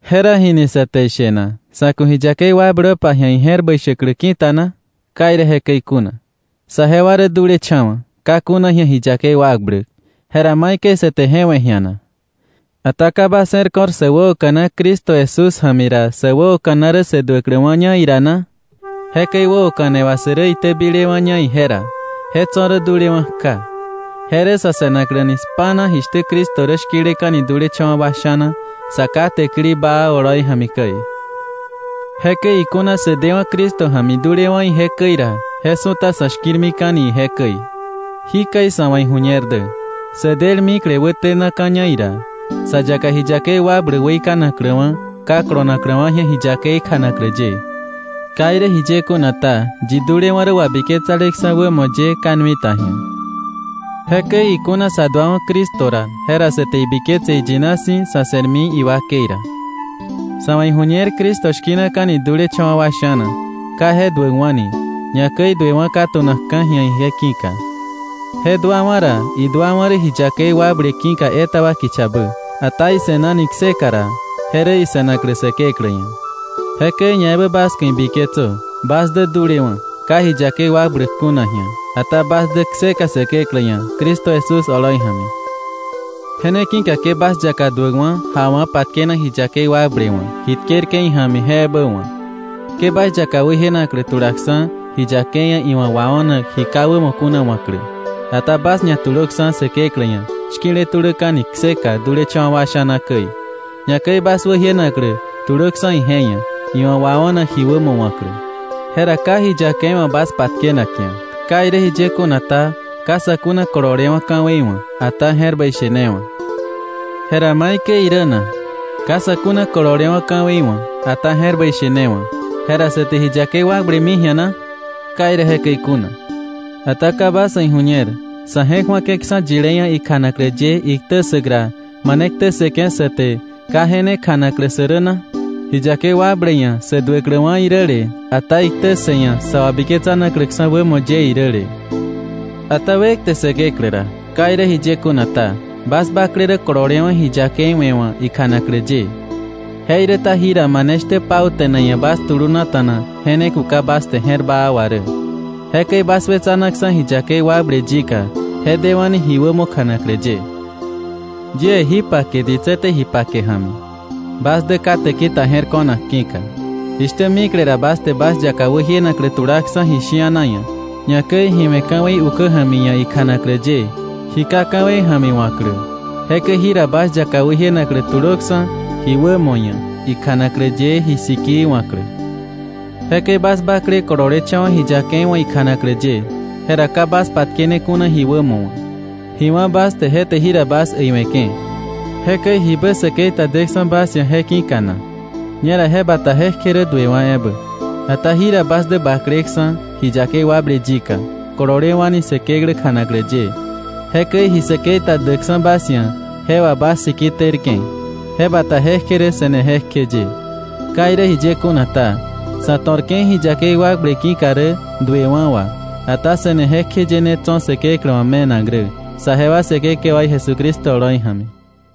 Jera, ¿jini sa te ishe na? ¿Sa̱ ku̱ ji yakei wakblöpa ji̱a ije̱r bäi shäklä ki̱ta na? ¡Ka irä jekäi kuna! Saje wa rä dulecha̱wa̱, ka kuna ji̱a ji yakei wakbläk, ¿jera maikäi sa te je we̱ ji̱a na? ¿Ata ka bas je̱r ko̱r sä wäoka̱na Cristo Jesús ja̱mi ra, sä wäoka̱na rä sä duäkläwa̱ña ira na? Jekäi wäoka̱ne wà, sä rä itäbilewa̱ña ije ra, je tso̱ rä dulewa̱ kja. Je rä sa̱ se̱nakläni spa̱na jishtä Cristo rä shki̱leka̱ni dulecha̱wa̱ wa sha̱na, Sa Ká täkili baa oloi ja̱mi käi. Jekäi ikuna sä dewa̱ Cristo ja̱mi dulewa̱ ije käi ra, je su̱ta sa̱ shki̱rmika̱ni ije käi. Jikäi sa̱ wa̱ ijuñer dä. Sä del mikle wätenaka̱ña ira, sa yaka ji yakei wakbläk weikanakläwa̱ ka kolonakläwa̱ ji̱a ji yakei kjanaklä ye. Ka irä jiye kuna ta, yi dulewa̱ rä wabiketsaleksa̱ wämo ye ka nui ta ji̱a. Jekäi ikuna sa duawa̱ Cristo ra, jera sa te ibiketse iyina si̱ sa̱ se̱rmi iwakei ra. Sa̱ wa̱ iju̱ñer Cristo shki̱naka̱ni dulecha̱wa̱ wa sha̱na, ka je duäkwa̱ni, ñakäi duewa̱ ka tu̱nakka̱ ji̱a ije ki̱ka. Je duawa̱ ra, iduawa̱ rä ji yakei wakble ki̱ka etaba kichabä. Ata ise̱nani kseka ra, je rä ise̱naklä Säkeklä ia̱. Jekäi ñaebä bas ku̱ ibiketsö bas dä dulewa̱, ka ji yakei wakbläk kuna ji̱a, ata bas dä kseka Säkeklä ia̱ Cristo Jesús oloi ja̱mi. Je ne ki̱ka ke bas yaka duäkwa̱ jawa̱ patkenak ji yakei wakble wa̱, ji tkerke̱ ija̱mi je ebä wa̱k. Ke bas yaka wäjienaklä tulaksa̱ ji yakei ia̱ iwa̱ wao̱nak ji ka wämo kuna wa̱klä. Ata bas ñatulöksa̱ Säkeklä ia̱ shki̱le tuläka̱ni kseka dulecha̱wa̱ wa sha̱na käi, ñakäi bas wäjienaklä tulöksa̱ ije ia̱, iwa̱ wao̱nak ji wämo wa̱klä. Jera ka ji yakei wa̱ bas patkenak ji̱a. Ka irä jiye kuna ta, ka sa̱ kuna kololewa̱ ka̱wei wa̱, ata je̱r bäi she ne wa̱. ¿Jera maikäi irä na? Ka sa̱ kuna kololewa̱ ka̱wei wa̱, ata je̱r bäi she ne wa̱, jera ¿sa te ji yakei wakblemi ji̱a na? ¡Ka irä jekäi kuna! Ata ¿ka bas wa̱ iju̱ñer sa̱ je̱k ju̱ake̱ksa̱ yilé ia̱ ikjanaklä ye iktä ssäk ra, mane ktä ssëke̱ sa te, ka je ne kjanaklä sä rä na? Ji yakei wakble ia̱ sä duäkläwa̱ iräle, ata iktä ssë ia̱ sa wabiketsanakläksa̱ wämo ye iräle. Ata wekte Säkeklä ra. Ka irä jiye kuna ta, bas bakle rä kololewa̱ ji yakei we̱ wa̱ ikjanaklä ye. Jeiräta jira mane shtä pauta̱ne ia̱ bas tulunata̱na je ne kuka bas te je̱r baa wà rä. Jekäi bas wetsanaksa̱ ji yakei wakble yika, je dewa̱ni ji wämo kjanaklä ye. Yie jí pake ditsä te ji pake ja̱mi bas dä ka täki ta je̱r ko̱nak ki̱ka. Jishtä mikle ra bas te bas yaka wäjienaklä tulaksa̱ ji shi̱ana ia̱, ñakäi ji we̱ ka̱wei ukä ja̱mi ia̱ ikjanaklä ye, ji ka ka̱wei ja̱mi wa̱klä, jekäi jira bas yaka wäjienaklä tulöksa̱ ji wämo ia̱, ikjanaklä ye ji sikii wa̱klä. Jekäi bas bakle kololecha̱wa̱ ji yakei wa̱ ikjanaklä ye, jera ka bas patkene kuna ji wämo wa̱. Ji wá̱ bas te je te jira bas äiwe̱ke̱. Jekäi ¿jibä säkei ta deksa̱ bas ia̱ je ki̱ka na? Ñera je bata jekje rä duewa̱ ebä. Ata jira bas dä bakleksa̱ ji yakei wakble yika, kololewa̱ni Säkeklä kjanaklä ye. Jekäi ji säkei ta däkksa̱ bas ia̱, je wà bas siki tërke̱. Je bata je kje rä se̱ne jekjeye. Ka irä jiye kuna ta, sa̱ to̱rke̱ ji yakei wakble ki̱ka rä duewa̱ wà. Ata se̱ne jekjeye ne tso̱ Säkeklä wa̱ me̱nak rä, saje wa Säkekewaí Jesucristo oloi ja̱mi.